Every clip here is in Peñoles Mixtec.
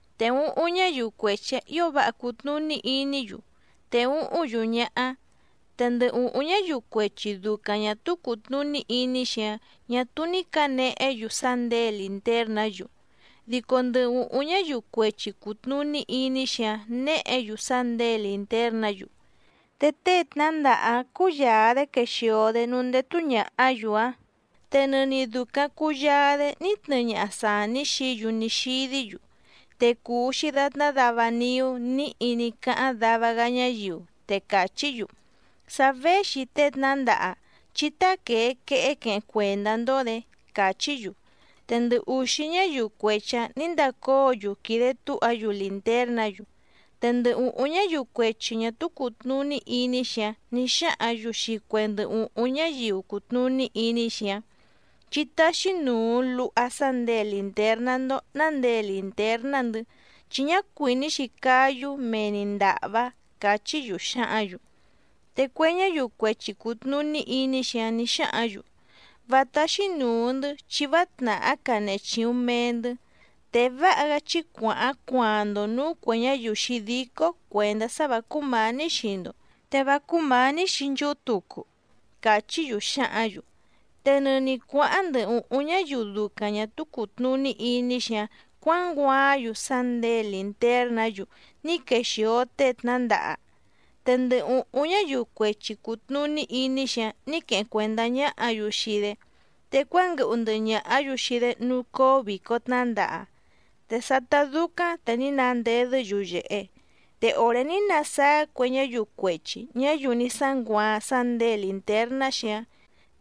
Te úhúⁿ ñáyiu cuechi‑ǎⁿ ǐo váha cùtnuní iní‑yu, te úhúⁿ‑yu ñáhá. Te ndɨ ùhúⁿ ñáyiu cuechi dùcaⁿ ñá túú cùtnuní iní‑xi‑áⁿ ñà túú ní cǎnehé‑yu sá nděe lìntérnǎ‑yu. Dico ndɨ ùhúⁿ ñáyiu cuechi cùtnuní iní‑xi‑áⁿ néhě‑yu sá nděe lìntérnǎ‑yu. Te tée tnándaha‑áⁿ cúyàa‑dé quexìo‑dé núú ndétú ñàhá‑yu‑áⁿ, te nɨni dùcaⁿ cuyaa‑dé ní tnɨɨ ñaha sàní xií‑yu ní xídí‑yu. Te cùu‑xi datná dava niú níhi ní cáháⁿ dava‑gá ñáyiu, te càchí‑yu: “Sa véxi tée tnándaha, chí táquèe quehé queheⁿ cuèndá‑ndó‑dě”, càchí‑yu. Te ndɨ ùxí ñáyiu cuechi‑ǎⁿ nǐ ndacóo‑yu quìde túha‑yu lìntérnǎ‑yu. Te ndɨ ùhúⁿ ñáyiu cuechi ñà túú cùtnuní iní‑xi‑áⁿ nǐ xáhǎⁿ‑yu xii cue ndɨ ùhúⁿ ñáyiu cùtnuní iní‑xi‑áⁿ: “Chí táxí nùu luha sá nděe lìntérná‑ndó ná nděe lìntérná‑ndɨ̌ chi ñá cuìní‑xi cáyú mee‑ni ndàhvá”, càchí‑yu xǎhǎⁿ‑yu. Te cue ñáyiu cuechi cùtnuní iní‑xi‑áⁿ nǐ xáhǎⁿ‑yu: “Vá táxí nùu‑ndɨ́ chi vá tnàhá canehe chìuⁿ mee‑ndɨ́, te váha‑gá chí cuàháⁿ cuaaⁿ‑ndo nǔú cuè ñáyiu xǐdícó cuèndá sá vǎ cúmǎní xii‑ndo, te vá cúmǎní xii nchúhú tucu”, càchí‑yu xǎhǎⁿ‑yu. Te nɨni cuǎháⁿ ndɨ ùhúⁿ ñáyiu ducaⁿ ñà túú cùtnuní iní‑xi‑áⁿ cuǎnguaáⁿ‑yu sá nděe lìntérnǎ‑yu ní quexìo tée tnándaha. Te ndɨ ùhúⁿ ñáyiu cuechi cùtnuní iní‑xi‑áⁿ nǐ queheⁿ cuèndá ñáhǎ‑yu xii‑dé, te cuánguɨhu ndɨhɨ ñàhá‑yu xii‑dé núú cóó vìco tnándaha, te sátá dúcáⁿ te ní nandedɨ́ yuyèhe. Te òré ní nasáá cue ñáyiu cuechi ñǎyiu ní sánguaaⁿ sá nděe lìntérná‑xi‑áⁿ,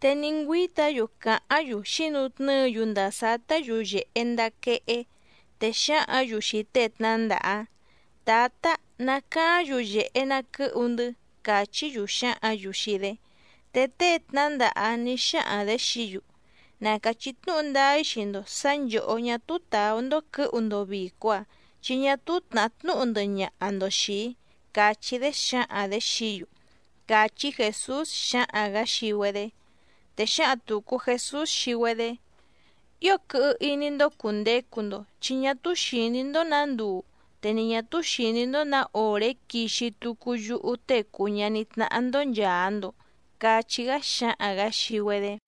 te ní ngüíta‑yu càháⁿ‑yu xǐnutnɨ́ɨ‑yu ndàa sátá yuyèhe ndaa quehé, te xǎhǎⁿ‑yu xii tée tnǎndaha‑áⁿ: “¡Tǎta, nacaáⁿ yuyèhe na quɨ́hu‑ndɨ́!”, càchí‑yu xǎhǎⁿ‑yu xii‑dé. Te tée tnǎndaha‑áⁿ nǐ xáhaⁿ‑dě xií‑yu: “Na càchí tnúhu ndáá‑í xii‑ndo sǎ nchòhó ñá túú tàú‑ndó quɨ̌hu‑ndo vìco‑a, chi ñá túú tnàhá tnúhu ndɨhɨ ñaha‑ndo xìi‑í”, càchí‑dé xǎhaⁿ‑dě xií‑yu —càchí Jèsús xǎhaⁿ‑gǎ xii‑güedé. Te xǎhaⁿ tùcu Jesús xii‑güedé: —Ío quɨhɨ iní‑ndó cùndecu‑ndo, chi ñá túú xìní‑ndó nǎ nduu, te ni ñà túú xìní‑ndó nǎ òré quixi tucu yúhú Tée cùu ñaní tnáhá‑ndó nchàa‑ndo —cachí‑gá xǎhaⁿ‑gǎ xii‑güedé.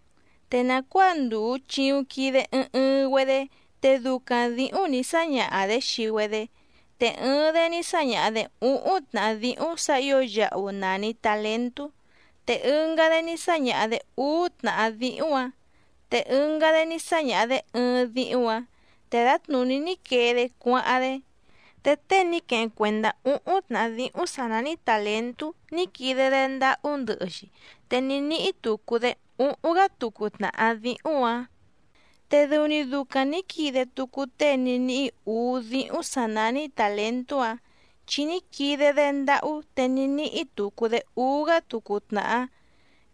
’Te nàcuáa ndùu chiuⁿ quide ɨɨⁿ ɨɨⁿ‑güedé te ducaⁿ dǐhúⁿ nǐ sáñaha‑dě xii‑güedé, te ɨɨⁿ‑dé ní sáñaha‑dě úhúⁿ tnàhá díhúⁿ sǎ ǐo yahu nàni talentú, te ɨngá‑dé ní sáñaha‑dě úú tnàhá díhúⁿ‑ǎⁿ, te ɨngá‑dé ní sáñaha‑dě ɨɨⁿ díhúⁿ‑ǎⁿ, te dǎtnùní ní quee‑dé cuáháⁿ‑dé. Te tée ní queheⁿ cuèndá úhúⁿ tnàhá díhúⁿ sǎ nání tàlentú ní quide‑dé ndáhú ndɨhɨ‑xi te ní níhí tucu‑dé úhúⁿ‑gá tucu tnàhá díhúⁿ‑ǎⁿ. Te dɨu‑ni ducaⁿ nǐ quide tucu tée ní níhí ǔú díhúⁿ sǎ nání tàlentú‑áⁿ, chi ní quide‑dé ndáhú te ní níhí tucu‑dé úú‑gá tucu tnàhá.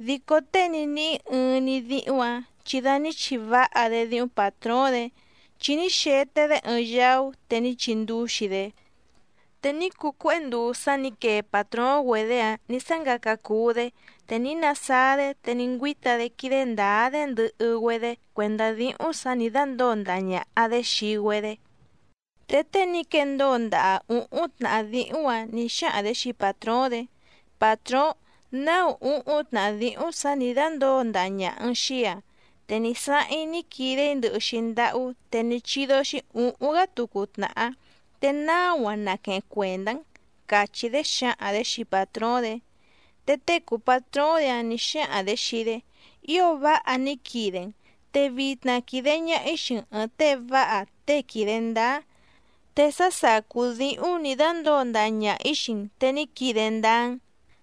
Dico tée ní níhí ɨɨⁿ‑ni díhúⁿ‑ǎⁿ chi da ní chiváha‑dé díhúⁿ pàtróóⁿ‑dě, chi ní xete‑dé ɨɨⁿ yaú te ní chindúxi‑dé. ’Te ní cuu cuéhé nduu sá nǐ quee pàtróóⁿ‑güedě‑áⁿ ní sángaca cuu‑dé, te ní nasáá‑dé te ní ngüíta‑dé quídé ndǎá‑dé ndɨhɨ‑güedé cuèndá díhúⁿ sǎ nǐ dándǒo ndaha ñàha‑dé xii‑güedé. Te tée ní quendóo ndaha ǔhúⁿ tnàhá díhúⁿ‑ǎⁿ nǐ xáhaⁿ‑dě xii pàtróóⁿ‑dě: “Pàtróóⁿ, náu úhúⁿ tnàhá díhúⁿ sǎ nǐ dándǒo ndaha ñàha‑n xii‑í‑a, te ní sáháⁿ‑í ní quide‑í ndɨhɨ‑xi ndáhú te ní chídó‑xí ǔhúⁿ‑gá tucu tnàhá, te náu‑a naqueheⁿ cuèndá‑n”, càchí‑dé xǎhaⁿ‑dě xii pàtróóⁿ‑dě. Te tée cùu patróóⁿ‑dě‑áⁿ nǐ xáhaⁿ‑dě xii‑dé: “Ío váha ní quide‑n, te vitna quìde ñaha‑í xii‑n ɨ̀ɨⁿ tée váha tée quìde ndáá, te sá sàcú díhúⁿ nǐ dándǒo ndaha ñaha‑ǐ xii‑n te ní quide ndáá‑n,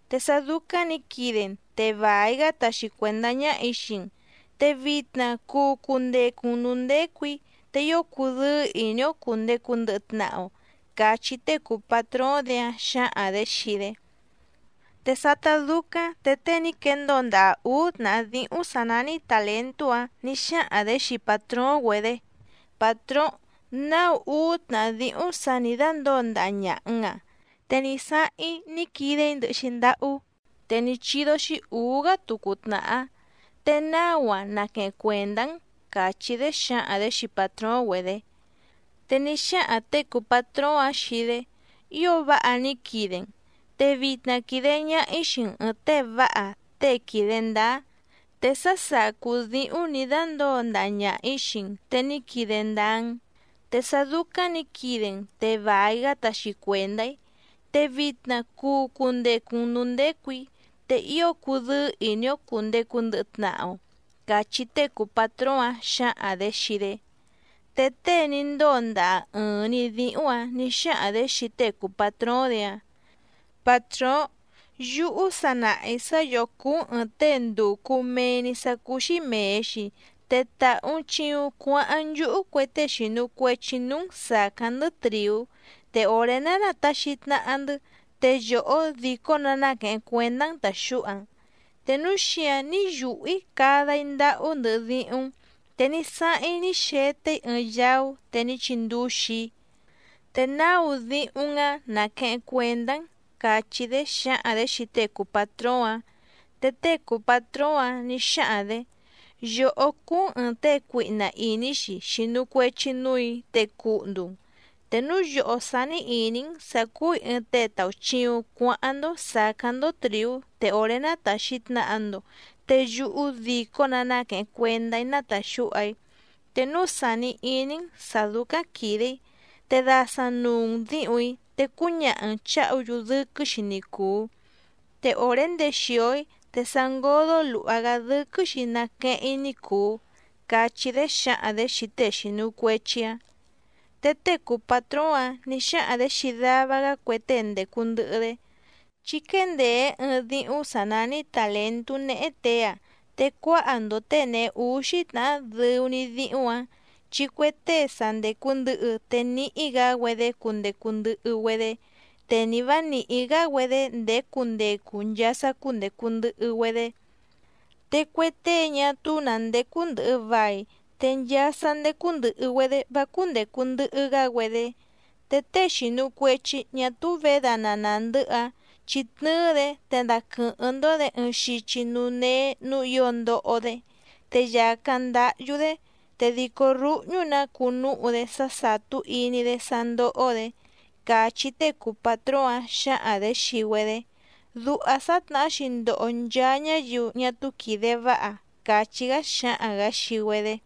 te sá dúcáⁿ nǐ quide‑n te vài‑gá taxi cuèndá ñáhà‑í xii‑n. Te vitna cuu cundecu‑n nǔú ndécù‑í, te ío cudɨ́ɨ́ ìní‑ó cùndecu ndɨhɨ tnaha‑o”, cachí tée cùu patróóⁿ‑dě‑áⁿ xǎhaⁿ‑dě xii‑dé. Te sátá dúcáⁿ te tée ní quendóo ndaha ǔú tnàhá díhúⁿ sǎ nání tàlentú‑áⁿ nǐ xáhaⁿ‑dě xii pàtróóⁿ‑güedě: “Pàtróóⁿ, náu úú tnàhá díhú sǎ nǐ dándǒo ndaha ñàha‑n‑a, te ní sáháⁿ‑í ní quide‑í ndɨhɨ‑xi ndáhú, te ní chídó‑xí ǔú‑gá tucu tnàhá, te náu‑a naqueheⁿ cuèndá‑n”, càchí‑dé xǎhaⁿ‑dě xii pàtróóⁿ‑güedě. Te ní xáhaⁿ těe cùu patróóⁿ‑áⁿ xii‑dé: “Ío váha ní quide‑n, te vitna quìde ñaha‑í xii‑n ɨ̀ɨⁿ tée váha tée quìde ndáá, te sá sàcú díhúⁿ nǐ dándǒo ndaha ñaha‑ǐ xii‑n te ní quide ndáá‑n, te sá dúcáⁿ nǐ quide‑n te vài‑gá taxi cuèndá‑í. Te vitna cuu cundecu‑n nǔú ndécù‑í, te ío cudɨ́ɨ́ ìní‑ó cùndecu ndɨhɨ tnaha‑o”, cachí tée cùu patróóⁿ‑áⁿ xǎhaⁿ‑dě xii‑dé. Te tée ní ndóo ndaha ɨ̀ɨⁿ‑ni díhúⁿ‑ǎⁿ nǐ xáhaⁿ‑dě xii tée cùu patróóⁿ‑dě‑áⁿ: “Pàtróóⁿ, yúhú sa nàha‑í sá yòhó cúú‑n ɨ̀ɨⁿ tée ndùcu mee‑ni sá cúú‑xí mèe‑xi te tàhu‑n chiuⁿ cuáháⁿ nchúhú cue tée xìnu cuechi núú‑n sàcáⁿ‑ndɨ́ trìú, te òré ná nàtaxi tnaha‑ndɨ́, te yòhó dìcó‑nǎ náquèheⁿ cuendá‑n tàxúha‑n. Te núu xíǎⁿ ní yùhú‑í cada‑í ndáhú ndɨhɨ díhúⁿ‑n, te ní sáháⁿ‑í ní xete‑í ɨɨⁿ yaú te ní chindúxi‑í, te náu díhúⁿ‑n‑áⁿ naqueheⁿ cuèndá‑n”, càchí‑dé xǎhaⁿ‑dě xii tée cùu patróóⁿ‑áⁿ. Te tée cùu patróóⁿ‑áⁿ nǐ xáhaⁿ‑dě: “Yòhó cúú‑n ɨ̀ɨⁿ tée cuihna ìní‑xi xìnu cuechi núù‑í te cuhndu‑n, te núu yòhó sání ìní‑n sǎ cúù‑í ɨɨⁿ tée tàuchiuⁿ cuáháⁿ‑ndó sàcáⁿ‑ndó trìú te òré nátàxi tnaha‑ndo, te yúhú dìcó‑nǎ náquèheⁿ cuendá‑í nátàxúha‑í. Te núu sàni iní‑n sǎ dúcáⁿ quìde‑í, te dasaⁿ nùu‑n díhùⁿ‑í te cúñaha‑n chǎhu‑yu dɨ́quɨ́‑xi ni cùu, te òré ndexìo‑í te sa ngódó lùha‑gá dɨ́quɨ́‑xi naqueheⁿ‑í ní cùu”, cachí‑dé xǎhaⁿ‑dě xii tée xìnu cuechi‑áⁿ. Te tée cùu patróóⁿ‑áⁿ nǐ xáhaⁿ‑dě xii dava‑gá cue tée ndècu ndɨhɨ‑dé: “Chí quéndèé ɨɨⁿ díhúⁿ sǎ nání tàlentú néhé těe‑áⁿ, te cuáha‑ndo těe nèhe úxí tnàhá dɨu‑ni díhúⁿ‑ǎⁿ. Chi cue tée sa ndècu ndɨhɨ te níhí‑gǎ‑güedé cundecu ndɨhɨ‑güedé, te ni vǎ nìhí‑gá‑güedé ndèé cundecu nchaa sá cúndècu ndɨhɨ‑güedé. Te cue tée ñá túú nǎ ndécú ndɨ̀hɨ vai, te nchaa sá ndécú ndɨ̀hɨ‑güedé vá cúndècu ndɨhɨ‑gá‑güedé. Te tée xìnu cuechi ñá túú vědana nàndɨ́hɨ‑áⁿ, chí tnɨ́ɨ́‑dě te daquɨ̀hɨ́ⁿ‑ndó‑dě ɨɨⁿ xichi núú néé nǔú ǐo ndoho‑dé, te yàcáⁿ ndáhyú‑dé, te dìcó rúhñú‑nǎ cuu núhu‑dé sá sàtú iní‑dé sá ndóhó‑dě”, càchí tée cùu patróóⁿ‑áⁿ xǎhaⁿ‑dě xii‑güedé. Duha sǎtnahá‑xi ndoho nchaa ñáyiu ñá túú quìde váha —càchí‑gá xǎhaⁿ‑gǎ xii‑güedé.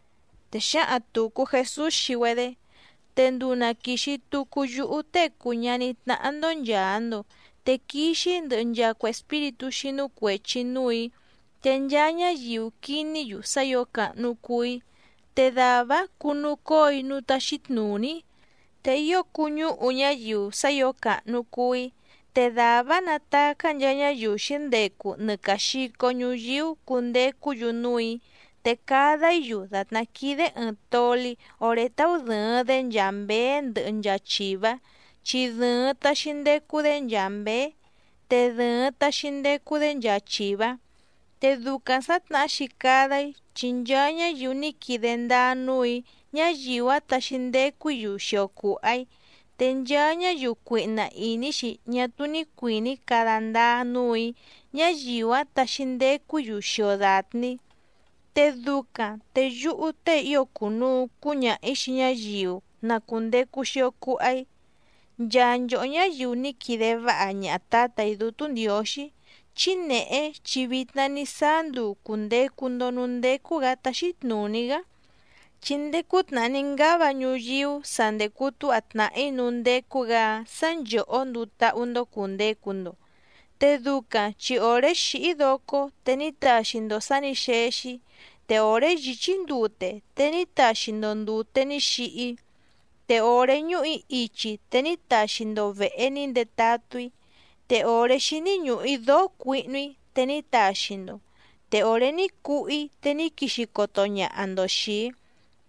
Te xǎhaⁿ tùcu Jesús xii‑güedé: —Te nduu na quìxi tucu yúhú Tée cùu ñaní tnáhá‑ndó nchàa‑ndo, te quixi‑í ndɨhɨ nchaa cue espíritú xínú cuèchi núù‑í, te nchaa ñáyiu quiní‑yu sá ǐo càhnu cuu‑í, te dàvá‑áⁿ cunucóo‑í núú táxí tnùní‑í, te ío cuñúhu ñáyiu sá ǐo càhnu cuu‑í. Te dàvá‑áⁿ natacá nchaa ñáyiu xǐndecu nɨ càa xico ñuyíú cundecú‑yu núù‑í, te cada‑í‑yu dàtná quídé ɨ̀ɨⁿ toli oré táú dɨ̀ɨⁿ‑dé nchaa mběé ndɨhɨ nchaa chìvá chi dɨ̀ɨⁿ taxi ndecu‑dé nchaa mběé, te dɨ̀ɨⁿ taxi ndecu‑dé nchaa chìvá. Te ducaⁿ sǎtnahá‑xi cada‑í chi nchaa ñáyiu ní quide ndáá núù‑í ñáyiu‑áⁿ taxi ndecu‑í‑yu xio cùha‑í, te nchaa ñáyiu cuihna ìní‑xi ñá túú ní cuìní cada ndáá núù‑í ñáyiu‑áⁿ taxi ndecu‑í‑yu xio dàtni‑í. Te ducaⁿ te yúhú tée ío cùnuu cúñaha‑ǐ xii ñáyiu na cùndecu xio cuha‑í: “Nchaa nchòhó ñáyiu ní quide váha ñaha Tǎtà‑í Dútú Ndiǒxí, chí nèhé chi vitna ní sáá nduu cùndecu‑ndo núú ndécú‑gǎ táxí tnùní‑gá, chi ndéé cútnàhá ní ngáva ñuyíú sa ndècu túha tnàhí núú ndécú‑gǎ‑áⁿ sǎ nchòhó nduu táhú‑ndó cùndecu‑ndo. Te ducaⁿ chi òré xìhí‑í docó te ní taxi‑ndo sǎ nǐ xexi‑í, te òré yìchí‑í ndute te ní taxi‑ndo ndùte ní xihi‑í, te òré ñúhù‑í ichi te ní taxi‑ndo vèhe ní ndetatú‑í. Te òré xíní ñùhu‑í dóó cuihnu‑í te ní taxi‑ndo, te òré ní cuhú‑í te ní quixi coto ñaha‑ndo xìi‑í,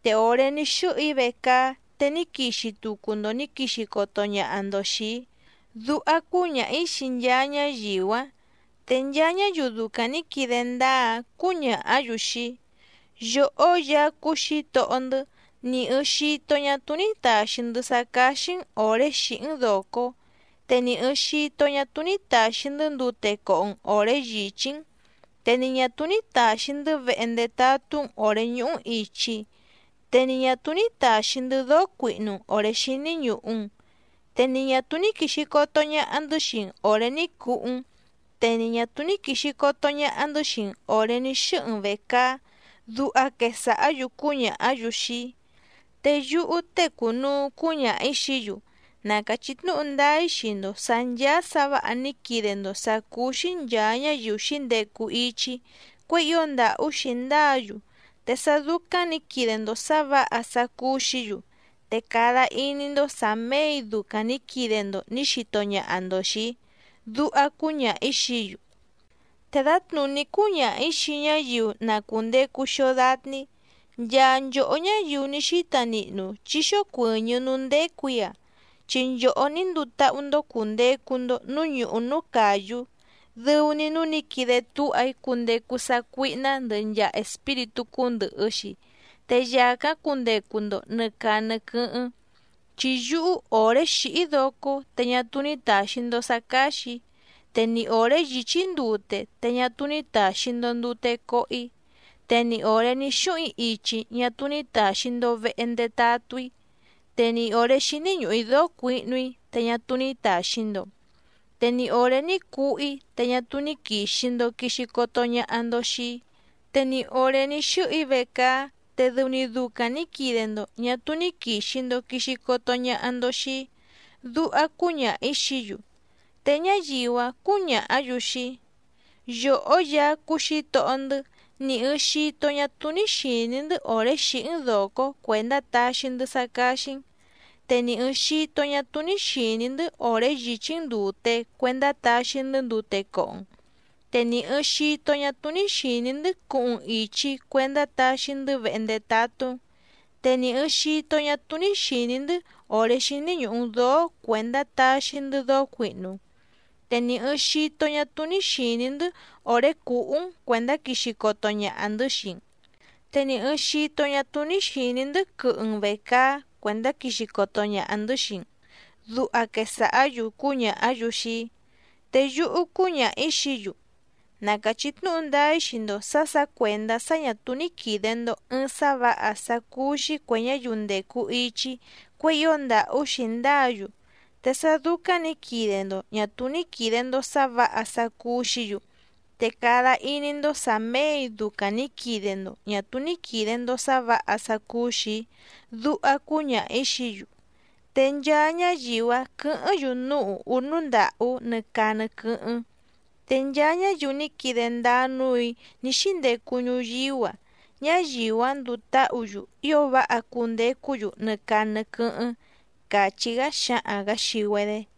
te òré ní xɨ́hɨ‑í vecaá te ní quixi tucu‑ndo nǐ quixi coto ñaha‑ndo xìi‑í”, duha cúñaha‑ǐ xii nchaa ñáyiu‑áⁿ. Te nchaa ñáyiu ducaⁿ nǐ quide ndáá‑áⁿ cǔñàhá‑yu xii‑í: “Yòhó Yaá cúú Xǐtohó‑ndɨ́, ni ɨ̀ɨⁿ xito ñá túú ní tàxi‑ndɨ́ sá cáxí‑n òré xìhí‑n dòcó, te ni ɨ̀ɨⁿ xito ñá túú ní tàxi‑ndɨ́ ndute coho‑n òré yìchí‑n. Te ni ñà túú ní tàxi‑ndɨ́ vehe ndetatú‑n òré ñúhú‑n ìchi, te ni ñà túú ní tàxi‑ndɨ́ dóó cuihnu‑n òré xíní ñùhu‑n. Te ni ñà túú ní quìxi coto ñaha‑ndɨ́ xii‑n òré ní cuhú‑n, te ni ñà túú ní quìxi coto ñaha‑ndɨ́ xii‑n òré ní xɨ́hɨ‑n vècaá”, duha quesàhá‑yu cúñàhá‑yu xii‑í. Te yúhú tée cùnuu cúñaha‑ǐ xií‑yu: “Na càchí tnúhu ndáá‑í xii‑ndo sǎ ncháá sǎ vǎha ní quide‑ndo sǎ cúú‑xí nchàa ñáyiu xǐndecu ichi‑í cuěi ío ndàhú xǐndáa‑yu, te sá dúcáⁿ nǐ quide‑ndo sǎ vǎha sá cúú‑xǐ‑yu, te cada iní‑ndó sǎ mèe‑í ducaⁿ nǐ quide‑ndo nǐ xito ñaha‑ndo xìi‑í”, duha cúñaha‑ǐ xií‑yu. ’Te dǎtnùní cúñaha‑ǐ xii ñáyiu na cùndecu xio datni‑í: “Nchaa nchòhó ñáyiu ní xíta nihnu chí xócuɨ̀ñɨ́ núú ndécù‑í‑a, chi nchòhó ní nduu táhú‑ndó cùndecu‑ndo núú ñùhú núú càyú, dɨu‑ni núú nǐ quide túha‑í cundecu sácuíhná ndɨhɨ nchaa espíritú cúndɨ̀hɨ‑xi, te yàcáⁿ cundecu‑ndo nɨ̀ caa nɨ quɨ́hɨ́ⁿ. Chi yúhú òré xìhí‑í docó te ñá túú ní tàxi‑ndo sá cáxì‑í, te ni òré yìchí‑í ndute te ñá túú ní tàxi‑ndo ndute coho‑í. Te ni òré ní xúhuⁿ‑í ichi ñá túú ní tàxi‑ndo vehe ndetatú‑í, te ni òré xíní ñùhu‑í dóó cuihnu‑í te ñá túú ní tàxi‑ndo, te ni òré ní cuhú‑í te ñá túú ní quìxi‑ndo quixi coto ñaha‑ndo xii‑í, te ni òré ní xɨ́hɨ‑í vecaá te dɨu‑ni ducaⁿ nǐ quide‑ndo ñà túú ní quìxi‑ndo quixi coto ñaha‑ndo xii‑í”, duha cúñaha‑ǐ xií‑yu. Te ñáyiu‑áⁿ cǔñàhá‑yu xii‑í: “Yòhó Yaá cúú Xǐtohó‑ndɨ́ ni ɨ̀ɨⁿ xito ñá túú ní xìní‑ndɨ́ òré xìhí‑n dòcó cuèndá taxi‑ndɨ́ sá cáxí‑n, te ni ɨ̀ɨⁿ xito ñá túú ní xìní‑ndɨ́ òré yìchí‑n ndùte cuendá taxi‑ndɨ́ ndute coho‑n, te ni ɨ̀ɨⁿ xito ñá túú ní xìní‑ndɨ́ cuhuⁿ‑n ìchi cuendá taxi‑ndɨ́ vehe ndetatú‑n, te ni ɨ̀ɨⁿ xito ñá túú ní xìní‑ndɨ́ òré xíní ñùhu‑n dóó cuèndá taxi‑ndɨ́ dóó cuihnu‑n, te ni ɨ̀ɨⁿ xito ñá túú ní xìní‑ndɨ́ òré cùhú‑n cuèndá quixi coto ñaha‑ndɨ̌ xii‑n, te ni ɨ̀ɨⁿ xito ñá túú ní xìní‑ndɨ́ quɨhɨ‑n vècaá cuèndá quixi coto ñaha‑ndɨ̌ xii‑n”, duha quesàhá‑yu cúñàhá‑yu xii‑í. Te yúhú cúñaha‑ǐ xií‑yu: “Na càchí tnúhu ndáá‑í xii‑ndo sǎ sǎ cuèndá sá ñà túú ní quìde‑ndo ɨɨⁿ sá vǎha sá cúú‑xí cuè ñáyiu ndècu ichi‑í cuěi ío ndàhú xǐndáa‑yu, te sá dúcáⁿ nǐ quide‑ndo ñà túú ní quìde‑ndo sá vǎha sá cúú‑xǐ‑yu, te cada iní‑ndó sǎ mèe‑í ducaⁿ nǐ quide‑ndo ñà túú ní quìde‑ndo sá vǎha sá cúú‑xì‑í”, duha cúñaha‑ǐ xií‑yu. Te nchaa ñáyiu‑áⁿ quɨ̌hɨ́ⁿ‑yu núú ùhú núú ndàhú nɨ caa nɨ quɨ́hɨ́ⁿ. Te nchaa ñáyiu ní quide ndáá núù‑í ní xíndecu ñuyíú‑a, ñáyiu‑áⁿ nduu táhǔ‑yu ío váha cundecú‑yu nɨ caa nɨ quɨ́hɨ́ⁿ —càchí‑gá xǎhaⁿ‑gǎ xii‑güedé.